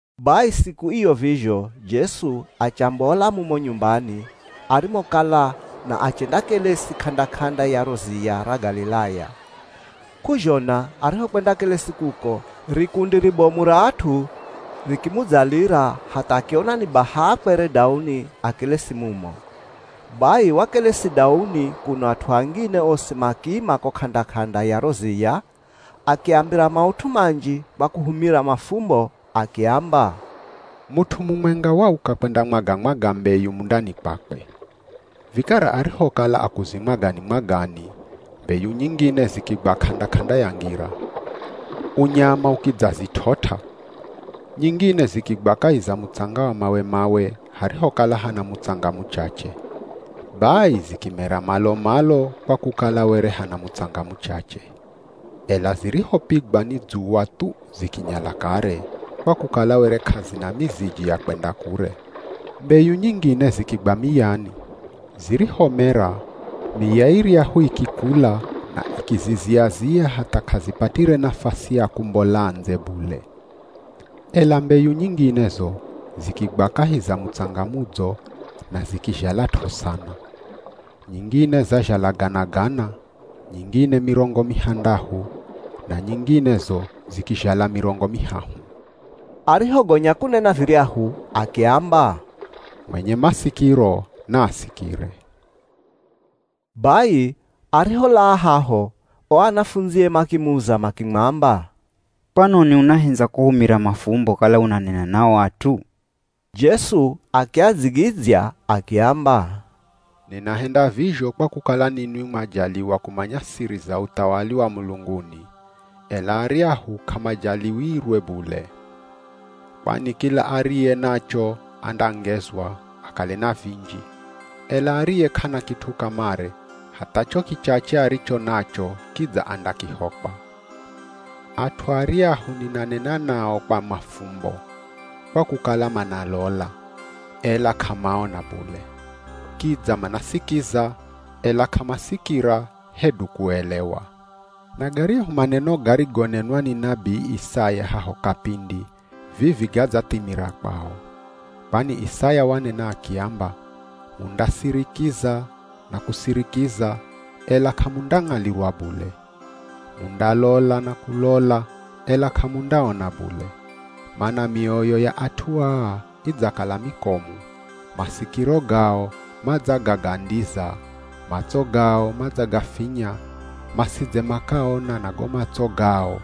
Bai siku iyo vizho, Jesu achambola mumo nyumbani arimokala na achendakelesi k'anda-k'anda ya ro ziya ra Galilaya. K'uzhona arihokwendakelesi kuko, rikundi ribomu ra at'u rikimudzalira hatha akiona ni baha akwere dauni akelesi mumo. Bai wakelesi dauni kuno at'u angine osi makiima ko k'anda-k'anda ya ro ziya. Akiambira maut'u manji kwa kuhumira mafumbo. Akiamba, “Mut'u mumwenga wauka kwendamwaga-mwaga mbeyu mundani kwakwe. Vikara arihokala akuzimwagani-mwagani, mbeyu nyingine zikigwa k'anda-k'anda ya ngira. Unyama ukidzazit'ot'a. Nyingine zikigwa kahi za mutsanga wa mawe-mawe, harihokala hana mutsanga muchache. Bai zikimera malo-malo kwa kukala were hana mutsanga muchache. Ela zirihopigwa ni dzuwa thu zikinyala kare, kwa kukala were k'azina miziji ya kwenda kure. Mbeyu nyingine zikigwa miyani. Zirihomera, miya iryahu ikikula na ikizizia-zia hatha k'azipatire nafasi ya kumbola ndze bule. Ela mbeyu nyingine zo zikigwa kahi za mutsanga mudzo, na zikizhalat'o sana. Nyingine zazhala gana-gana, nyingine mirongo mihandahu, na nyingine zo zikizhala mirongo mihahu.” Arihogonya kunena viryahu akiamba, “Mwenye masikiro, naasikire.” Bai, ariholaa haho, o anafundzie makimuza makimwamba, “Kwanoni unahendza kuhumira mafumbo kala unanena na o at'u?” Jesu akiadzigidzya akiamba, “Ninahenda vizho kwa kukala ninwi mwajaliwa kumanya siri za uthawali wa mulunguni, ela aryahu k'amajaliwirwe bule. Kwani kila ariye nacho andangezwa, akale na vinji, ela ariye k'ana kit'u kamare, hatha cho kichache aricho nacho kidza andakihokwa. At'u aryahu ninanena nao kwa mafumbo, kwa kukala manalola, ela k'amaona bule, kidza manasikiza, ela k'amasikira hedu kuelewa. Na garyahu maneno garigonenwa ni nabii Isaya haho kapindi vivi gadzathimira kwao. Kwani Isaya wanena akiamba, ‘Mundasirikiza na kusirikiza ela k'amundang'alirwa bule. Mundalola na kulola ela k'amundaona bule. Mana mioyo ya at'u aa idzakala mikomu, masikiro gao madzagagandiza, matso gao madzagafinya, masidze makaona na go matso gao,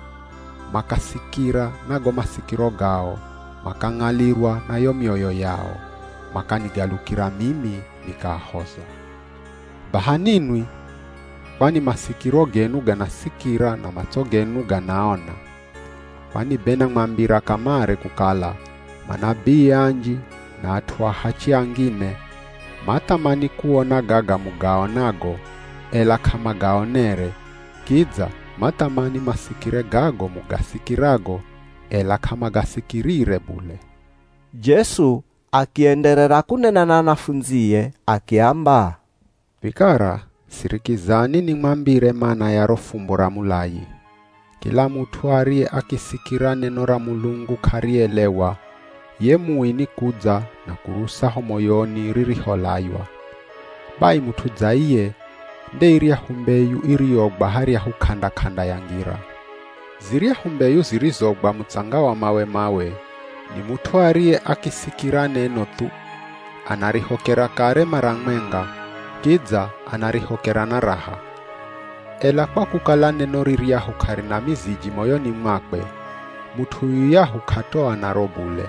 makasikira na go masikiro gao, makang'alirwa na yo mioyo yao, makanigalukira mimi, nikaahoza.’ Baha ninwi, kwani masikiro genu ganasikira na matso genu ganaona. Kwani be namwambira kamare kukala, manabii anji na at'u ahachi angine, mathamani kuona gaga mugaonago, ela k'amagaonere, kidza mathamani masikire gago mugasikirago, ela k'amagasikirire bule.” Jesu akienderera kunena na anafundzie akiamba, “Vikara, sirikizani nimwambire mana ya ro fumbo ra mulayi. Kila mut'u ariye akisikira neno ra Mulungu k'arielewa, ye Mui nikudza na kurusa ho moyoni ririholaywa. Bai mut'u dza iye nde iryahu mbeyu iriyogwa haryahu k'anda-k'anda ya ngira. Ziryahu mbeyu zirizogwa mutsanga wa mawe-mawe, ni mut'u ariye akisikira neno thu, anarihokera kare mara mwenga, kidza anarihokera na raha. Ela kwa kukala neno riryahu k'arina miziji moyoni mwakwe, mut'u yuyahu k'atoa naro bule.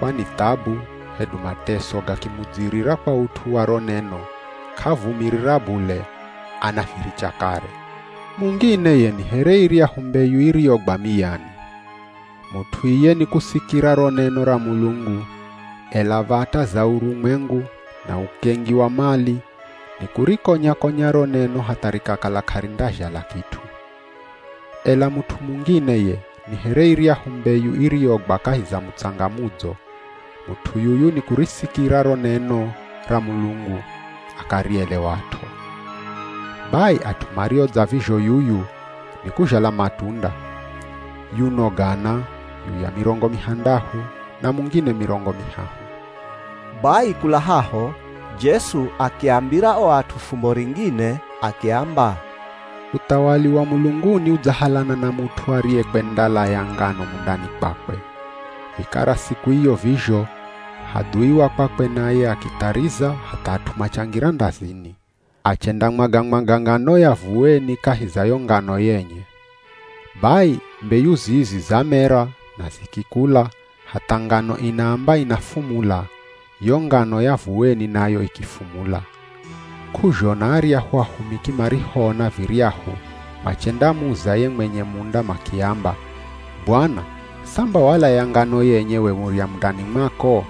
Kwani thabu, hedu mateso gakimudzirira kwa ut'u wa ro neno, k'avumirira bule, anaviricha kare. Mungine ye ni here iryahu mbeyu iriyogwa miyani. Mut'u iye nikusikira ro neno ra Mulungu, ela v̱ata za urumwengu, na ukengi wa mali, nikurikonya-konya ro neno hatha rikakala k'arindazhala kit'u. Ela mut'u mungine ye ni here iryahu mbeyu iriyogwa kahi za mutsanga mudzo. Mut'u yuyu nikurisikira ro neno ra Mulungu, akarielewat'o. Bai at'u mario dza vizho yuyu, nikuzhala matunda. Yuno gana, yuya mirongo mihandahu, na mungine mirongo mihahu.” Bai kula haho, Jesu akiambira o at'u fumbo ringine akiamba, “Uthawali wa mulunguni udzahalana na mut'u ariyekwendalaya ngano mundani kwakwe. Vikara siku iyo vizho, hadhui wa kwakwe naye, akithariza hatha at'u machangira ndazini, achendamwaga-mwaga ngano ya vuweni kahi za yo ngano yenye. Bai, mbeyu zizi zamera na zikikula hatha ngano inaamba inafumula, yo ngano ya vuweni nayo ikifumula. K'uzhona aryahu ahumiki marihoona viryahu machendamuza ye mwenye munda makiamba, ‘Bwana, samba walaya ngano yenye we murya mundani mwako!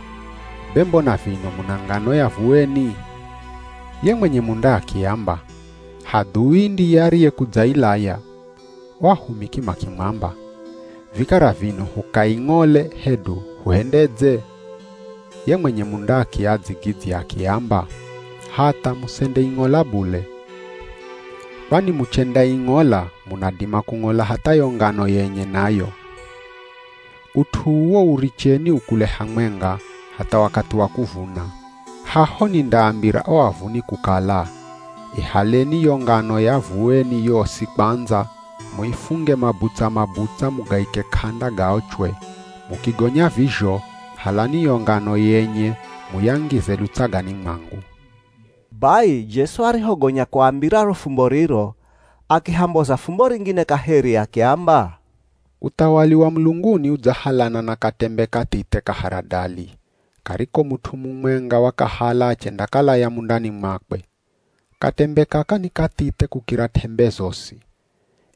Be mbona vino muna ngano ya vuweni?’ Ye mwenye munda akiamba, ‘Hadhui ndiye ariyekudzailaya.’ O ahumiki makimwamba, ‘Vikara vino hukaing'ole hedu huhendedze?’ Ye mwenye munda akiadzigidzya akiamba, ‘Hatha, musendeing'ola bule. Kwani muchendaing'ola munadima kung'ola hatha yo ngano yenye nayo. Ut'u uwo uricheni ukule hamwenga, hatha wakathi wa kuvuna. Haho nindaambira o avuni kukala, “Ihaleni yo ngano ya vuweni yosi kwandza, muifunge mabutsa-mabutsa mugaike k'anda gaochwe. Mukigonya vizho, halani yo ngano yenye muyangize lutsagani mwangu.”’” Bai Jesu arihogonya kuambira ro fumbo riro, akihamboza fumbo ringine kaheri akiamba, “Uthawali wa mulunguni udzahalana na katembe kathithe ka haradali, kariko mut'u mumwenga wakahala achendakalaya mundani mwakwe. Katembe kaka ni kathithe kukira t'embe zosi.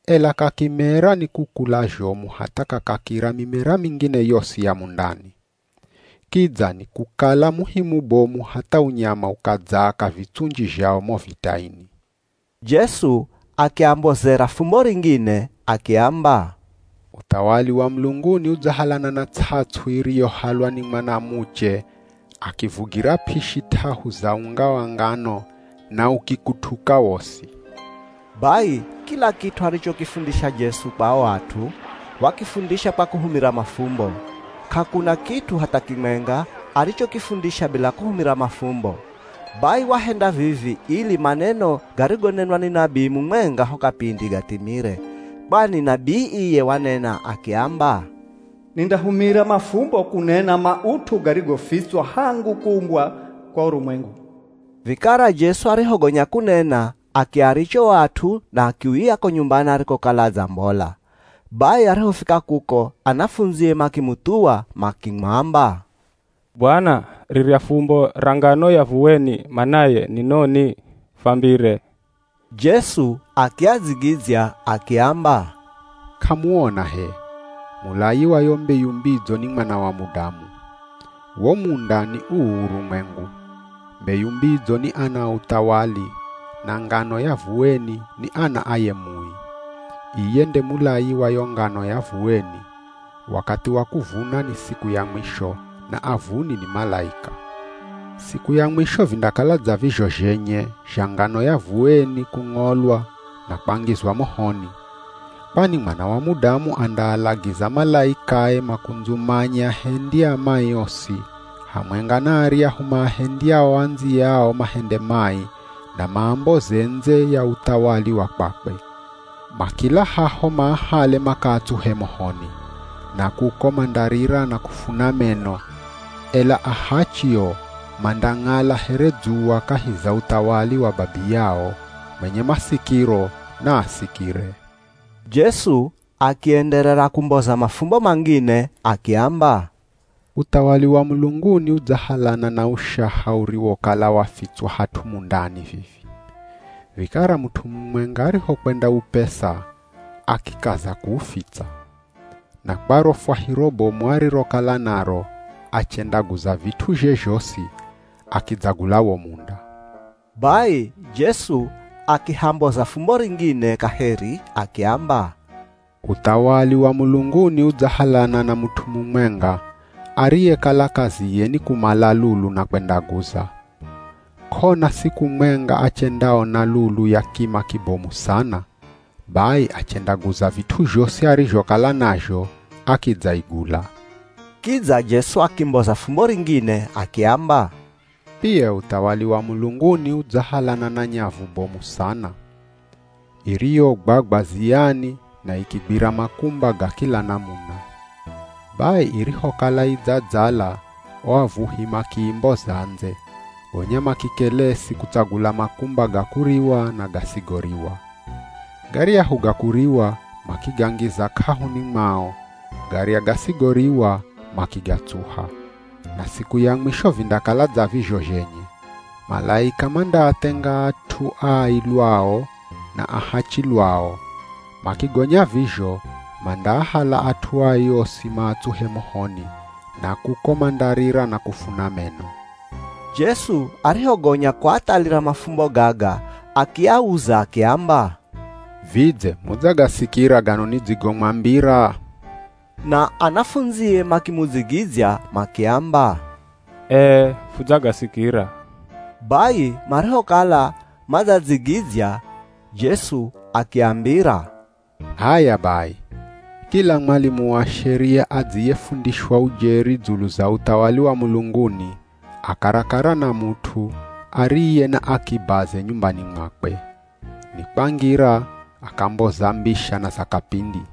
Ela kakimera, nikukula zhomu hatha kakakira mimera mingine yosi ya mundani. Kidza nikukala muhi mubomu hatha unyama ukadzaaka vitsunji zhao mo vitaini.” Jesu akiambozera fumbo ringine, akiamba, “Uthawali wa mulunguni udzahalana na ts'ats'u iriyohalwa ni mwanamuche akivugira p'ishi t'ahu za unga wa ngano na ukikutuka wosi.” Bai kila kit'u arichokifundisha Jesu kwa o at'u, wakifundisha kwa kuhumira mafumbo, k'akuna kit'u hatha kimwenga arichokifundisha bila kuhumira mafumbo. Bai wahenda vivi ili maneno garigonenwa ni nabii mumwenga ho kapindi gathimire. Kwani nabii iye wanena akiamba, “Nindahumira mafumbo kunena maut'u garigofitswa hangu kuumbwa kwa urumwengu.” Vikara Jesu arihogonya kunena akiaricha o at'u na akiuya ko nyumbani arikokala adzambola. Bai arihofika kuko anafundzie makimuthuwa makimwamba, “Bwana, rirya fumbo ra ngano ya vuweni manaye ni noni? Fambire.” Jesu akiadzigidzya akiamba, “K'amuona h'e, mulayi wa yo mbeyu mbidzo ni Mwana wa Mudamu. Wo munda ni uu urumwengu. Mbeyu mbidzo ni ana a Uthawali, na ngano ya vuweni ni ana a ye Mui. Iye nde mulayi wa yo ngano ya vuweni. Wakathi wa kuvuna ni siku ya mwisho, na avuni ni malaika. Siku ya mwisho vindakala dza vizho zhenye, zha ngano ya vuweni kung'olwa na kwangizwa mohoni. Kwani Mwana wa Mudamu andaalagiza malaikae makundzumanye ahendi a mai osi, hamwenga na aryahu maahendyao andziyao mahende mai, na maamboze ndze ya uthawali wa kwakwe. Makila haho maahale makaatsuhe mohoni. Na kuko mandarira na kufuna meno. Ela ahachi o, mandang'ala here dzuwa kahi za uthawali wa Babiyao. Mwenye masikiro, naasikire.” Jesu akienderera kumboza mafumbo mangine akiamba, “Uthawali wa mulunguni udzahalana na ushaha uriwokala wafitswa hat'u mundani vivi. Vikara mut'u mumwenga arihokwendaupesa akikaza kuufitsa. Na kwa ro fwahiro bomu arirokala naro achendaguza vit'uzhe zhosi, akidzagula wo munda.” Bai Jesu akihamboza fumbo ringine kaheri akiamba, “Uthawali wa mulunguni udzahalana na mut'u mumwenga, ariyekala kaziye ni kumala lulu na kwendaguza. K'ona siku mwenga achendaona lulu ya kima kibomu sana. Bai achendaguza vit'u zhosi arizhokala nazho, akidzaigula.” Kidza Jesu akimboza fumbo ringine, akiamba, “Pia uthawali wa mulunguni udzahalana na nyavu bomu sana, iriyogwagwa ziyani na ikigwira makumba ga kila namuna. Bai irihokala idzadzala o avuhi makiimboza ndze, gonya makikelesi kutsagula makumba ga kuriwa na gasigoriwa. Garyahu ga kuriwa makigangiza k'ahuni mwao, garya gasoriwa makigatsuha. Na siku ya mwisho vindakala dza vizho zhenye. Malaika mandaathenga at'u, ai lwao, na ahachi lwao. Makigonya vizho, mandaahala at'u ai osi maatsuhe mohoni, na kuko mandarira na kufuna meno.” Jesu arihogonya kuathalira mafumbo gaga akiauza akiamba, “Vidze mudzagasikira gano nidzigomwambira?” Na anafundzie makimudzigidzya makiamba, “Ee hudzagasikira.” Bai marihokala madzadzigidzya, Jesu akiambira, “H'aya bai, kila mwalimu wa sheria adziyefundishwa ujeri dzulu za uthawali wa mulunguni, a karakara na mut'u ariye na akibaze nyumbani mwakwe. Ni kwangira akamboza mbisha na za kapindi.”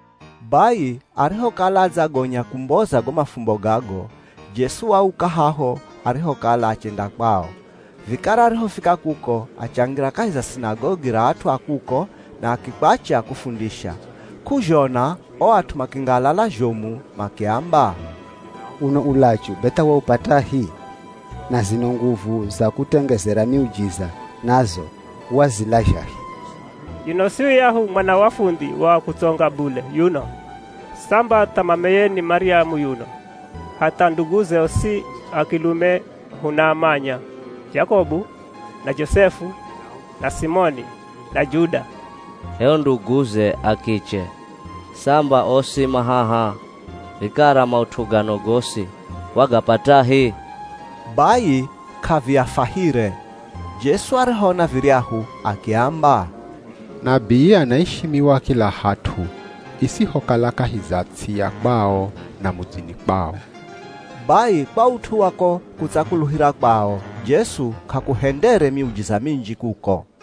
Bai arihokala adzagonya kumboza go mafumbo gago, Jesu wauka haho arihokala achenda kwao. Vikara arihofika kuko, achangira kahi za sinagogi ra at'u a kuko na akikwacha kufundisha. K'uzhona o at'u makingalala zhomu makiamba, “Uno ulachu be tha waupatahi? Na zino nguvu za kutengezera miujiza nazo wazilazhahi? Yuno si yuyahu mwana wa fundhi wa kutsonga bule yuno? Samba tha mameye ni Maryamu yuno. Hatha nduguze osi a kilume hunaamanya: Jakobu, na Josefu, na Simoni, na Juda. H'e o nduguze a kiche, samba osi ma haha! Vikara maut'u gano gosi wagapatahi?” Bai k'aviafahire. Jesu arihoona viryahu akiamba, “Nabii anaishimiwa kila hat'u isihokala kahi za ts'i ya kwao, na mudzini kwao.” Bai kwa ut'u wa ko kutsakuluhira kwao, Jesu k'akuhendere miujiza minji kuko.